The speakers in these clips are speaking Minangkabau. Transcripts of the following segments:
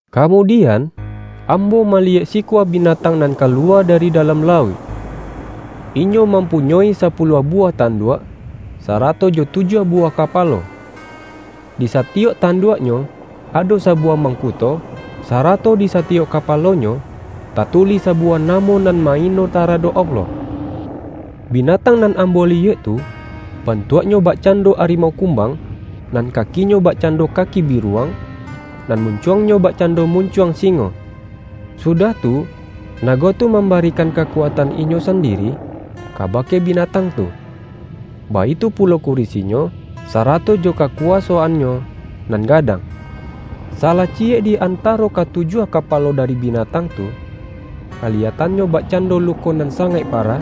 Kamudian, ambo maliyek si-kua binatang nan kaluwa dari dalam lauik. Inyo mampunyoi sapu-luah buwah tanduak, sarato jo tujuah buwah kapalo. Di satiyok tanduak-nyo, ado sabuwah mangkuto, sarato di satiyok kapalonyo, tatulih sabuwah namo nan ma-ino taradok Allah. Bi-natang nan ambo liyek tu, bantuak-nyo bakcando arimau kumbang, nan kakinyo bakcando kaki biruwang, nan muncuangnyo bakcando mun-cuang singo. Sudah tu, nago tu mam-barikan kakuatan inyo sandiri kabake binatang tu, baitu pulo kurisinyo, sa-rato jo kakuwasoannyo nan gadang. Salah ciyek di antaro katujuah kapa-lo dari binatang tu, kaliyatannyo bak-cando luko nan sangaik parah,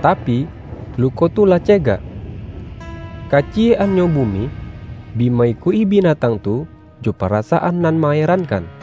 tapi, luko tu lah cegak. Kaciyek-annyo bu-mi, bi ma-ikuik-i binatang tu jo para-saan nan ma-erankan.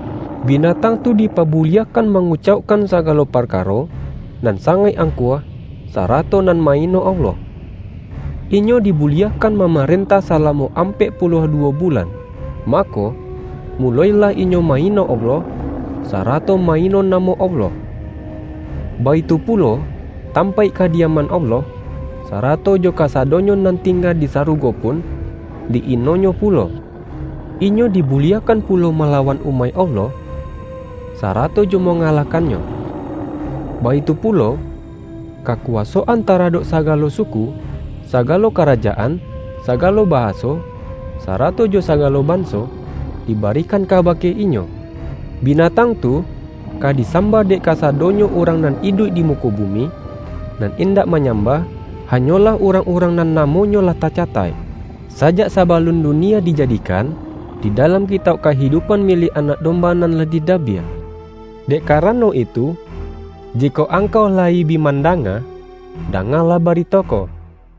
Binatang tu dipabuliahkan mangu-caukkan sagalo parkaro nan sangaik angkuah, sarato nan ma-ino Allah. Inyo dibuliahkan mamarentah sala-mo ampek puluah duwo bulan. Ma-ko, muloilah inyo ma-ino Allah, sa-rato ma-ino namo Allah. Baitu pulo, tampaik kadiaman Allah, sarato jo ka-sadonyo nan tingga di sarugo pun, di-inonyo pulo. Inyo dibuliahkan pulo malawan umaik Allah, sarato jo ma-ngalahkannyo. Baitu pulo, kakuwaso-an taradok sagalo suku, sagalo kara-jaan, sagalo bahaso, sarato jo sagalo banso, dibarikan kabake inyo. Bina-tang tu, ka disambah dek kasadonyo urang nan iduik di muko bumi, nan indak manyambah, hanyolah urang-urang nan namonyo lah tacataik, sa-jak sabalun dunia dijadikan, di dalam Kitauk Kahidupan miliak Anak Dom-ba nan lah didabiah. Dek karano itu, jikok angkau la-yi bi mandanga, dangalah barito ko: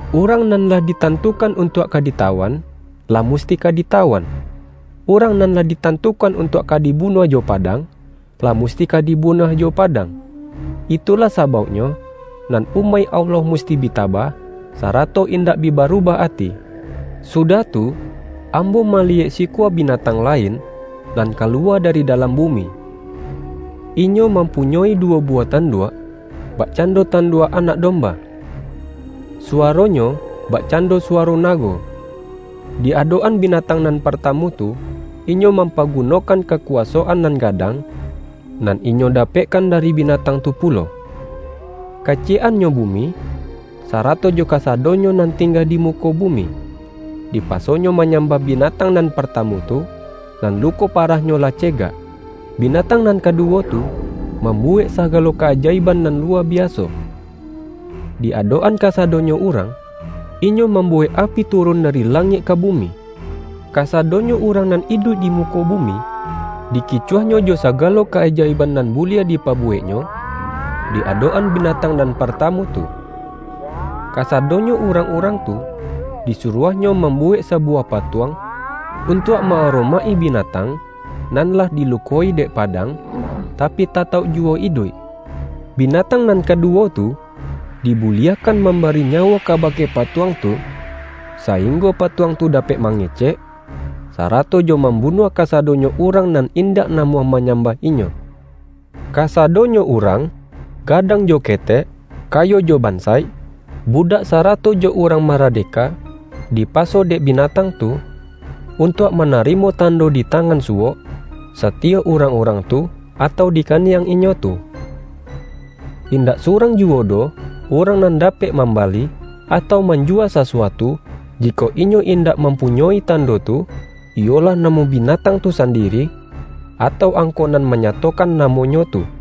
”Urang nan lah ditantukan untuak ka ditawan, lah musti ka ditawan. Urang nan lah ditantukan untuak ka dibunuah jo padang, lah musti ka di-bunuah jo padang. Itulah sabauknyo, nan umaik Allah musti bi tabah, sara-to indak bi barubah ati.” Sudah tu, ambo maliyek sikua bi-natang lain, nan kaluwa dari dalam bumi. Inyo mampunyoi duwo buwah tanduak, bakcando tanduak anak domba. Suwaronyo, bakcando suwa-ro nago. Di adok-an binatang nan partamu tu, inyo mampagunokan ka-kuwasoan nan gadang, nan inyo da-pekkan dari binatang tu pulo. Kaci-yek-annyo bumi, sarato jo kasadonyo nan tingga di muko bumi, dipaso-nyo manyambah binatang nan parta-mu tu, nan luko parahnyo lah cegak. Binatang nan kaduwo tu, mambu-wek sagalo ka-ajaiban nan luwa bi-aso. Di adok-an kasadonyo urang, inyo mambuwek api turun dari langik ka bumi. Kasadonyo urang nan iduik di muko bumi, dikicuahnyo jo sagalo ka-ajaiban nan buliah dipabuweknyo di adok-an binatang nan partamu tu. Ka-sadonyo urang-urang tu, disuruahnyo mambuwek sabuwah patuang, untuak ma-aromaik-i binatang nan lah dilukoi dek padang, tapi tatauk juwo iduik. Binatang nan kaduwo tu, dibuliah-kan mambari nyawo kabake patuang tu, sainggo patuang tu dapek mange-cek, sarato jo mambunuah kasadonyo urang nan indak namuah manyambah inyo. Kasadonyo urang, gadang jo ketek, kayo jo bansaik, budak sarato jo urang maradeka, dipaso dek binatang tu, untuak manarimo tando di tangan suwok, satiyok urang-urang tu, atau di kaniang inyo tu. Indak surang juwo doh urang nan dapek mambali, atau manjuwa sasuatu, jikok inyo indak mampunyoi tando tu, iyolah namo bi-natang tu sandiri, atau angko nan ma-nyatokan namonyo tu.